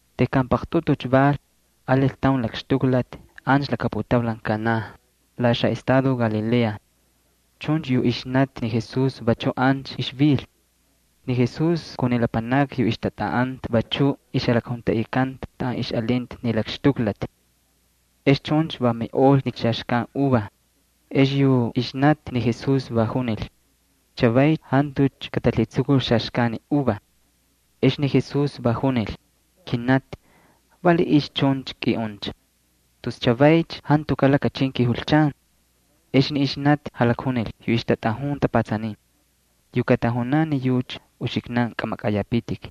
Tejkan paqtꞌutucha val, alil taun lakxtuklati ancha laka putaulan Kaná, la xaꞌestado Galilea. Chuncha yu ixnati ni Jesús vachuꞌ ancha ixvil. Ni Jesús kun ni lapanakni yu ixtatꞌaꞌanta vachuꞌ ixjalakjuntaꞌikanta taꞌan ixꞌalinta ni lakxtuklati. Ex chuncha va miꞌol ni xaxkan uva. Ex yu ixnati ni Jesús va junil: —Chavay jantucha katalhitsukul xaxkan uva. Ex ni Jesús va junil: —Kinati, ¿valiꞌiycha chuncha kꞌiꞌuncha? Tus chavaycha jantukaꞌ lakachin kijulchan. Ex ni ixnati jalakjunil yu ixtatꞌajun tapatsanin: —Yu katajunan ni yucha, uxiknan kꞌamakꞌayapitik.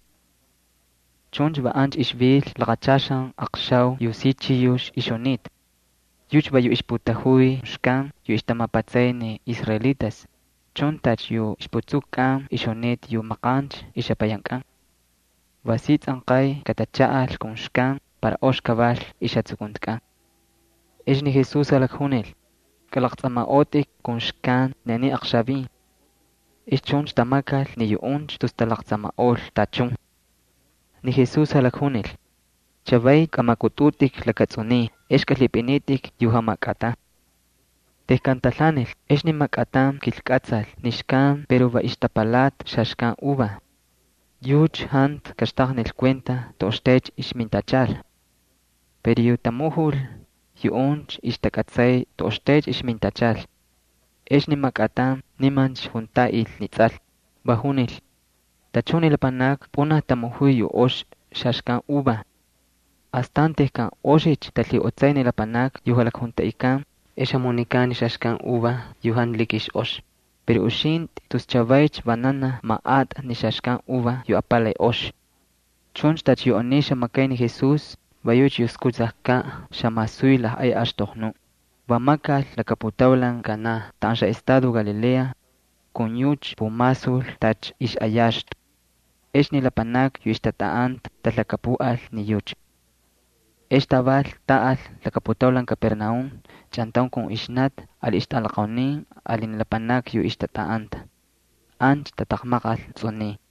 Chuncha va ancha ixvil laqachaxan aqxau yu jamakanti chiyux. Yucha va yu ixputajuy xkan yu ixtamapatsay ni israelitas, chuncha tacha yu ixputsukukꞌan ixjunita yu maqancha ixjapayankꞌan. Va si tsꞌanqay katachaꞌal kun xkan para ox kaval ixjatsukuntikꞌan. Ex ni Jesús jalakjunil: —Kꞌalaqtsꞌamaꞌotꞌik kun xkan ni aniy aqxavin. Ex chuncha tamakal ni yuꞌuncha tus talaqtsamaꞌol tachun. Ni Jesús jalakjunil: —Chavay kꞌamakꞌutꞌutꞌik lakatsꞌuniy ex kꞌalhipꞌinitꞌik yu jamakꞌatan. Tejkan talhaanil ex ni makꞌatan kilkꞌatsal ni xkan pero va ixtapalata xaxkan uva. Yucha jantu kaxtaqnil kuenta toꞌoxtaycha ixmintachal. Pero yu tamujul, yuꞌuncha ixtakꞌatsay toꞌoxtay ixmintachal. Ex ni makꞌatan nimancha juntaꞌil ni tsꞌal, va junil: —Tachun ni lapanakni pꞌunaj tamujuy yu ox xaxkan uva. Astan tejkan oxicha talhiꞌotsay ni lapanakni yu jalakjuntaꞌikan ex jamunikan ni xaxkan uva yu jantu la ox. Pero uxintꞌi tus chavaycha vananaj maꞌatꞌa ni xaxkan uva yu apalay ox. Chuncha tacha yu aniy xamakay ni Jesús, va yucha yu skutsajkaꞌ xamasuy lajꞌay axtoqnu, va makal laka putaulan Kaná taꞌan xaꞌestado Galilea. Va yucha pumasul ixꞌayaxtu. Ex ni lapanakni yu ixtatꞌaꞌanta talhakapuꞌal ni yucha. Ex taval taꞌal laka putaulan Capernaúm chꞌantaun kun ixnati ali ixtꞌalaqaunin ali ni lapanakni yu ixtatꞌaꞌanta. Ancha tataqmaqal tsꞌuniy.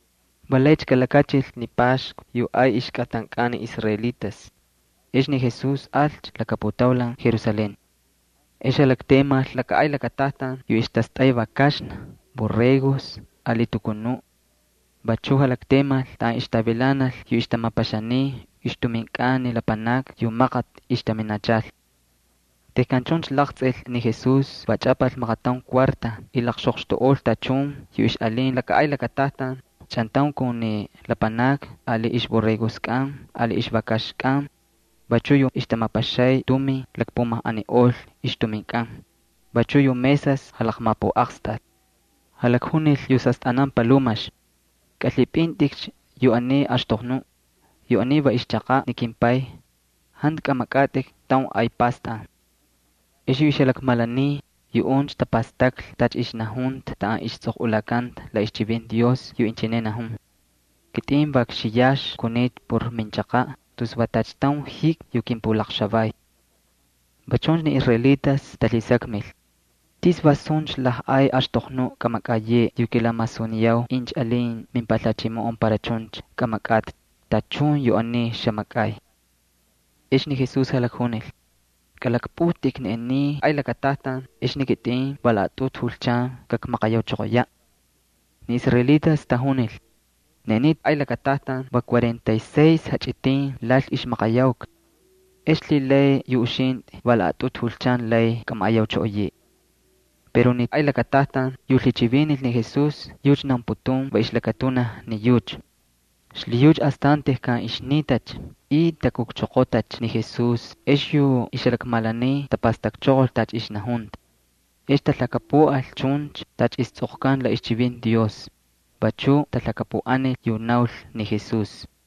Va laycha kalakachil ni Paxku yu ay ixkꞌatankꞌan ni israelitas. Ex ni Jesús alcha laka putaulan Jerusalén. Ex jalaktemal laka ay lakatajtan yu ixtastꞌay vakaxna ali borregos ali tukunuꞌ. Vachu jalaktemal taꞌan ixtavilanal yu ixtamapaxaniy ixtuminkꞌan ni lapanakni yu maqati ixtaminachal. Tejkan chuncha laqtsꞌil ni Jesús va chꞌapal maqataun cuarta y laqxoqxtuꞌol tachun yu ixꞌalin laka ay lakatajtan, chꞌantaun kun ni lapanakni ali ixborregoskꞌan ali ixvakaxkꞌan. Vachu yu ixtamapaxay tumin lakpumajꞌaniꞌol ixtuminkꞌan, vachuꞌ yu mesas jalaqmapuꞌaqstal. Jalakjunil yu xastꞌanan palumax: —Kꞌalhipꞌintꞌikcha yu aniy axtoqnuꞌ. Yu aniy va ixchaqaꞌ ni kimPay. ¡Jantu kꞌamakꞌatꞌik taun ay pastꞌan! Ex yu ixjalakmalaniy, yuꞌuncha tapastaklhi tacha ixnajunta taꞌan istsꞌoqꞌulakanta la ixchivinti Dios yu inchineꞌ najun: “Kitꞌin va kxiyax kunita por minchaqaꞌ tus va tacha taun jikmi yu kimpulakxavay.” Va chuncha ni israelitas talhisakmil: —¿Tis va suncha lajꞌay axtoqnuꞌ kꞌamakꞌayeꞌe yu kilamasuniyau incha alin mimpalhachimoꞌon para chuncha kꞌamakꞌatꞌi tachun yu aniy xamakꞌay? Ex ni Jesús jalakjunil: —Kꞌalakpꞌujtꞌik ni aniy ay lakatajtan, ex ni kitꞌin va laꞌatꞌutu julchan kakmaqayauchoqoyaꞌ. Ni israelitas tajunil: —Ni aniy ay lakatajtan va cuarenta y seis jachꞌitin lal ixmaqayauka. ¿Ex lhilay yu uxintꞌi va laꞌatꞌutu julchan lay kꞌamaꞌayauchꞌoꞌoyeꞌe? Pero ni ay lakatajtan yu lhichivinil ni Jesús yucha naunputun va ixlakatunaj ni yucha. Xlhiyucha astan tejkan ixnitacha y takukchoqotacha ni Jesús ex yu ixjalakmalaniy tapastakchoqol tacha ixnajunta. Ex talhakapuꞌal chuncha tacha istsꞌoqkanta la ixchivinti Dios, vachu talhakapuꞌanil yu naul ni Jesús.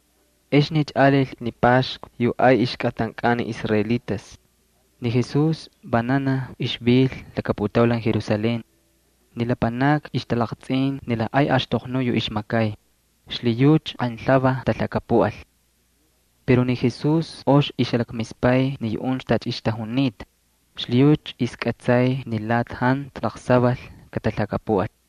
Exnicha alil ni Paxku yu ay ixkꞌatankꞌan ni israelitas. Ni Jesús vananaj ixvil laka putaulan Jerusalén. Ni lapanakni ixtalaqtsꞌin ni lajꞌay axtoqnuꞌ yu ixmakay, xlhiyucha qaynlhuvaj talhakapuꞌal. Pero ni Jesús ox ixjalakmispay ni yuꞌuncha tacha ixtajunita, xlhiyucha ixkꞌatsay ni lati jantu laqsaval katalhakapuꞌal.